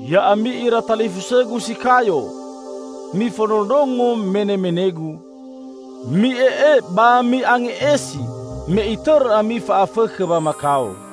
Ya'ami ira talifusõgu si kayo! Mifondrondrongo menemenegu. Mi'e'e ba mi'ange'esi me itõrõ ami fa'afõkhõ wamakao.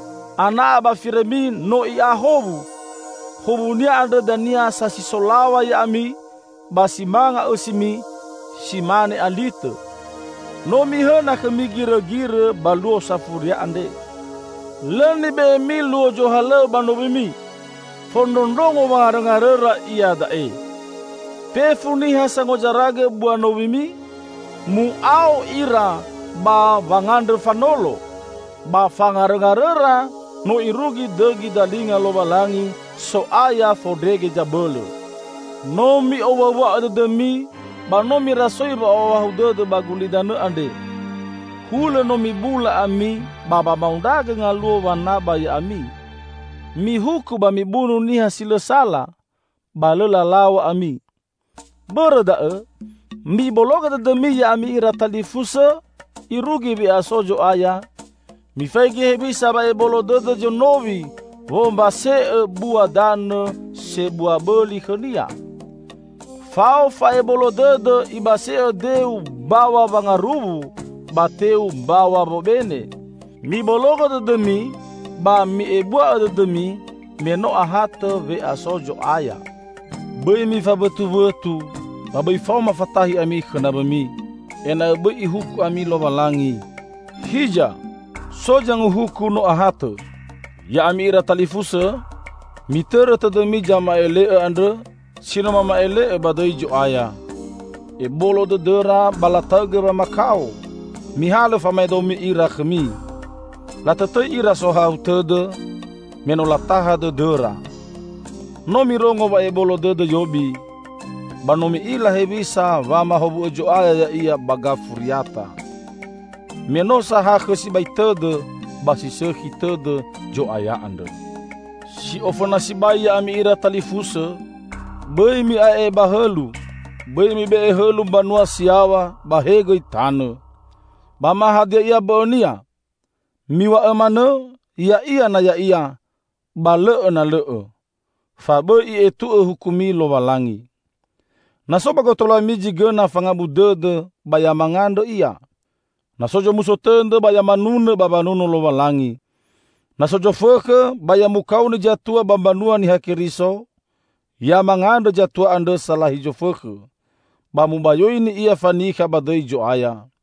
Ana'a ba firõmi no i'a howu, howunia andrõ dania sasi solaw̃a ya'ami ba si manga õsimi si mane alitõ. No mihõna khõmi girõgirõ ba luo safuria andre. Lõ nibe'emi luo zohalõw̃õ ba nowimi. Fondrondrongo wangarõngarõra iada'e. Fefu niha sangozaragõ bua nowimi, mu'ao ira ba wangandrõ fanolo. Ba fangarõngarõra no irugi dõgi dalinga Lowalangi, So'aya Fondrege Zabõlõ. No mi'owuawua'õ dõdõmi ba no mirasoi wa'ohahau dõdõ ba gulidanõ andre. Hulõ no mibula ami ba wamaondragõ ngaluo wanaba ya'ami. Mihuku ba mibunu niha si lõ sala, ba lõ lalaw̃a ami. Bõrõ da'õ, mibologõ dõdõmi ya'ami ira talifusõ irugi we'aso Zo'aya. Mifaigi hewisa wa'ebolo dõdõ zonowi wombase'õ bua danõ sebua bõli khõnia. Fao fa'ebolo dõdõ ibase'õ deu mbaw̃a wangaruwu, ba teu mbaw̃a wobene. Mibologõ dõdõmi ba mi'ebua'õ dõdõmi me no ahatõ we'aso Zo'aya. Bõi mifawõtuwõtu ba bõi faoma fatahi ami khõ nawõmi, ena'õ bõi Ihuku ami Lowalangi. Hiza! So Zanguhuku, no ahatõ. Ya'ami ira talifusõ, mitõrõ tõdõmi zama'ele'õ andrõ si no mama'ele'õ ba dõi Zo'aya. Ebolo dõdõra ba lataõgõ wamakao. Mihalõ famaedo ira khõmi. Latõtõi ira sohahau tõdõ me no lataha dõdõra. No mirongo wa'ebolo dõdõ Yobi, ba no mi'ila hewisa wamahowu'õ Zo'aya ya'ia ba gafuriata. Me no sahakhõ sibai tõdõ ba si sõkhi tõdõ Zo'aya andrõ. Si ofõna sibai ya'ami ira talifusõ, bõi mi'ae'e ba hõlu, bõi mibe'e hõlu mbanua si yaw̃a ba he gõi tanõ, ba ma hadia ia mbõ'õnia. Miw̃a'õ manõ "Ya'ia" na ya'ia ba "Lõ'õ" na lõ'õ, fa bõi I'etu'õ hukumi Lowalangi. Na so ba gotaluami zi gõna fangabu dõdõ ba ya mangandrõ ia. Na so zomuso tõdõ ba ya manunõ ba wanuno Lowalangi. Na so zofõkhõ ba ya mukaoni zatua ba mbanua Niha Keriso, ya mangandrõ zatua andrõ salahi zofõkhõ, ba mubayoini ia fanikha ba dõi Zo'aya.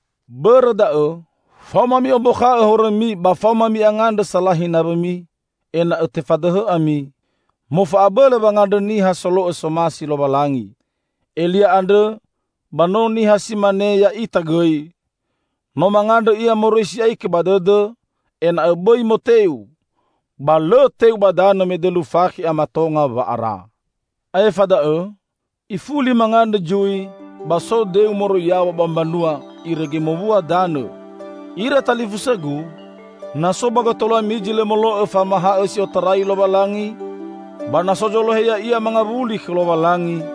Bõrõ da'õ faoma mi'ombakha'õ horõmi ba faoma mi'angandrõ salahi nawõmi, ena'õ tefadõhõ ami. Mofa'abõlõ wangandrõ niha solo'õ somasi Lowalangi. Elia andrõ ba no niha si mane ya'ita gõi. No mangandrõ ia moroi si'aikõ ba dõdõ ena'õ bõi moteu, ba lõ teu ba danõ me dõlu fakhe a matonga wa'ara. Aefa da'õ, ifuli mangandrõ zui, ba so deu moroi yaw̃a ba mbanua irege mowua danõ. Ira talifusõgu! Na so ba gotaluami zi lõ molo'õ famahaõ si otarai Lowalangi, ba na so zolohe ya'ia mangawuli khõ Lowalangi,